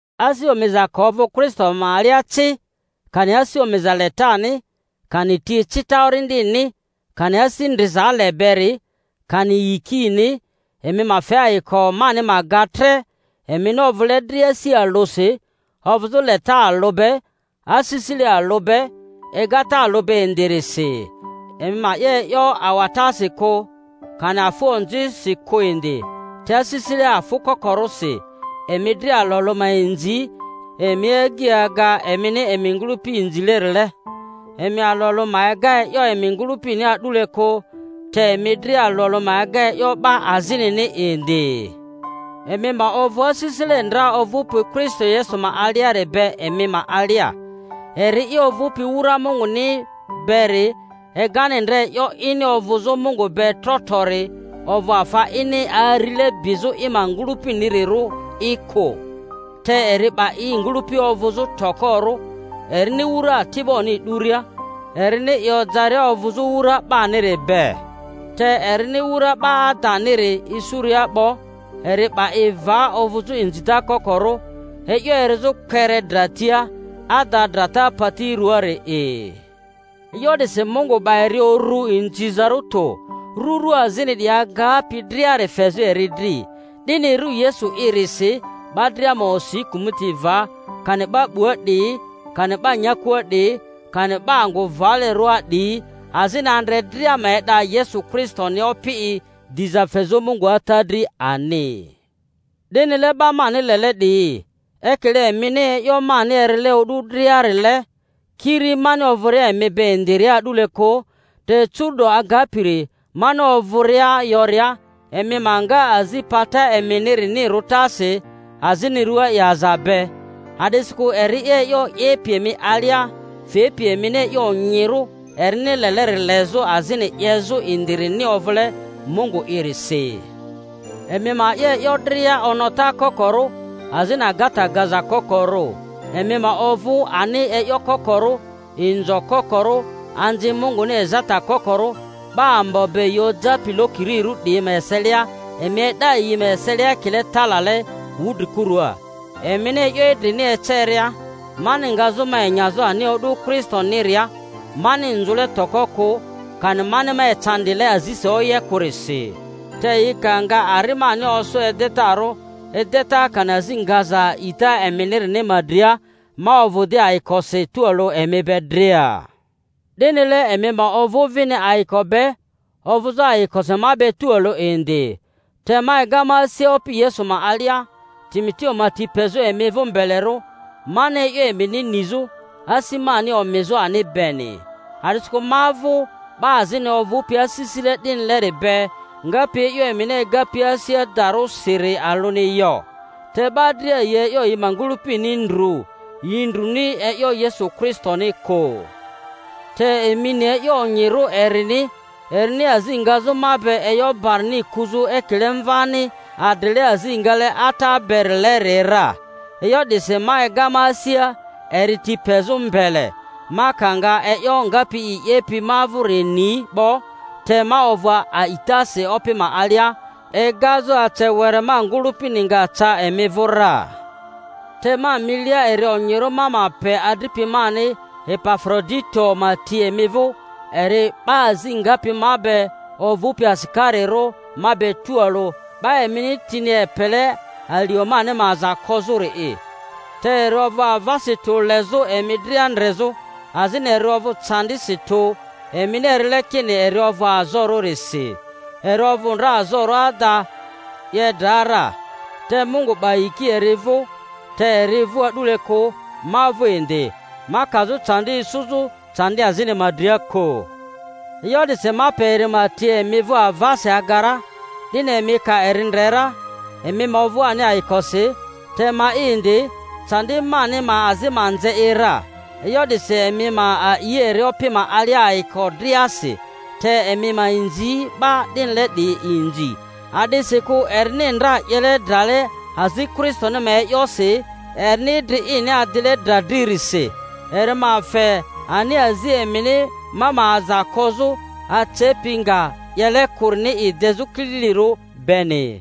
Asi omiza ka ovᴜ Kristo ma alia ci, kani asi omiza letani, kani ti ecita Orindini, kani asi ndriza ale beri, kani yikini, emi ma fe ayiko mani ma ga tre, emini ovᴜle dria asi alᴜsi, ovᴜzᴜ leta alᴜ be, asisile alᴜ be, egata alᴜ be indirisi. Emi ma 'ye e'yo awatasi kᴜ, kani afᴜ onzisi kᴜ indi, te asisile afᴜ kokorᴜsi emi dria alᴜ alᴜ ma inzi emi agyi aga emini emi ngᴜlᴜpi inzilerile. Emi alᴜ alᴜ ma ega e'yo emi ngᴜlᴜpini a'dule kᴜ, te emi dria alᴜ alᴜ ma ega e'yo 'ba azinini indi. Emi ma ovᴜ asisile ndra ovᴜpi Kristo Yesu ma aliari be emi ma alia, eri'i ovᴜpi wura Munguni beri egani ndra e'yo ini ovᴜzᴜ Mungu be tro trori ovᴜ afa ini arile bizᴜ i ma ngᴜlᴜpinirᴜri'i kᴜ, te eri 'ba i ngᴜlᴜpi ovᴜzᴜ tokorᴜ, erini wura ati'boni 'duria, erini i ojaria ovᴜzᴜ wura 'baniri be. Te erini wura 'ba adaniri isuria 'bo, eri 'ba i va ovᴜzᴜ inzita kokorᴜ, e'yo erizᴜ kpere dra tia, ada drata pati rᴜaari'i. E'yo 'disi Mungu 'ba eri uru inzizarᴜ tᴜ, ru ru azini 'diyi agapi driari fezᴜ eri dri, 'dini ru Yesu'irisi 'ba dria ma osi kᴜmᴜti va, kani 'ba 'bua 'diyi, kani 'ba nyakua 'diyi, kani 'ba angᴜ valerᴜa 'diyi, azini andre dria ma e'da Yesu Kristoni Opi'i, diza fezᴜ Mungu Ata dri ani. 'Dinile, 'ba mani lele 'diyi, ekile emini e'yo mani erile o'du dria-rile, kiri mani ovᴜria emi be indiria a'dule kᴜ, te curu'do agapiri mani ovᴜria yoria, emi ma nga azi pata eminirini rutasi azini rua yaza be; a'disikᴜ eri'i e'yo 'yepi emi alia fepi emini e'yo onyirᴜ erini leleri lezᴜ azini 'yezᴜ indirini ovᴜle Mungu'irisi. Emi ma 'ye e'yo dria onota kokorᴜ azini agata gaza kokorᴜ, emi ma ovᴜ ani e'yo kokorᴜ, inzo kokorᴜ, anzi Munguni ezata kokorᴜ, 'ba ambo be yi ojapi lokirirᴜ 'diyi ma eselia; emi e'da yi ma eselia ekile talale wudrikurua, emini e'yo idrini eceria; mani ngazᴜ ma enyazᴜ ani o'du Kristoniria, mani nzᴜle toko kᴜ, kani mani ma ecandile azisi oye kᴜrisi. Te yi ka nga ari mani osᴜ edetarᴜ, edeta kani azi ngaza a'ita eminirini ma dria, ma ovᴜ di ayikosi tualᴜ emi be dria. 'Dinile emi ma ovᴜ vini ayiko be, ovᴜzᴜ ayikosi ma be tualᴜ indr. Te ma ega ma asia Opi Yesu ma alia, Timoteo ma ti pezᴜ emi vᴜ mbelerᴜ, mani e'yo emini nizᴜ, asi mani omizᴜ ani beni. A'disikᴜ ma vᴜ 'ba azini ovᴜpi asisile 'dinileri be, ngapi e'yo emini egapi asi adarᴜrisiri alᴜni yo. Te 'ba dria yi e'yo yi ma ngᴜlᴜpini ndru, yi ndruni e'yo Yesu Kristoni kᴜ. Te emi ni e'yo onyirᴜ erini, erini azi ngazᴜ ma be e'yo barini kuzᴜ ekile mvani adrile azi ngale ata berileri ra. E'yo 'disi ma ega ma asia eri ti pezᴜ mbele, ma ka nga e'yo ngapi i 'yepi ma vᴜri ni 'bo; te ma ovᴜ a'itasi Opi ma alia egazᴜ ace were ma ngᴜlᴜpini nga ca emi vᴜ ra. Te ma milia eri onyirᴜ ma ma pe adripi mani Epafrodito ma ti emi vᴜ, eri 'ba azi ngapi ma be ovᴜpi asikarirᴜ ma be tualᴜ, 'ba emini tini epele alio mani ma aza kozᴜri'i; te eri ovᴜ avasi tᴜ lezᴜ emi dria ndrezᴜ, azini eri ovᴜ candisi tᴜ emini erile kini eri ovᴜ azorᴜrisi. Eri ovᴜ ndra azorᴜ ada, 'ye dra ra. Te Mungu 'ba yiki eri vᴜ, te eri vᴜ a'dule kᴜ, ma vᴜ indi, ma kazᴜ candi isuzᴜ candi azini ma dria kᴜ. E'yo 'disi ma pe eri ma ti emi vᴜ avasi aga ra, 'dini emi ka eri ndre ra emi ma ovᴜ ani ayikosi, te ma'i indi, candi mani ma azi ma nze i ra. E'yo 'disi emi ma a'i eri Opi ma alia ayiko driasi; te emi ma inzi 'ba 'dinile 'diyi inzi, a'disikᴜ erini ndra 'yele drale azi Kristoni ma e'yosi, erini idri ini adile dra dririsi, eri ma fe ani azi emini ma ma aza kozᴜ acepi nga 'yele kᴜrini i dezᴜ kililirᴜ beni.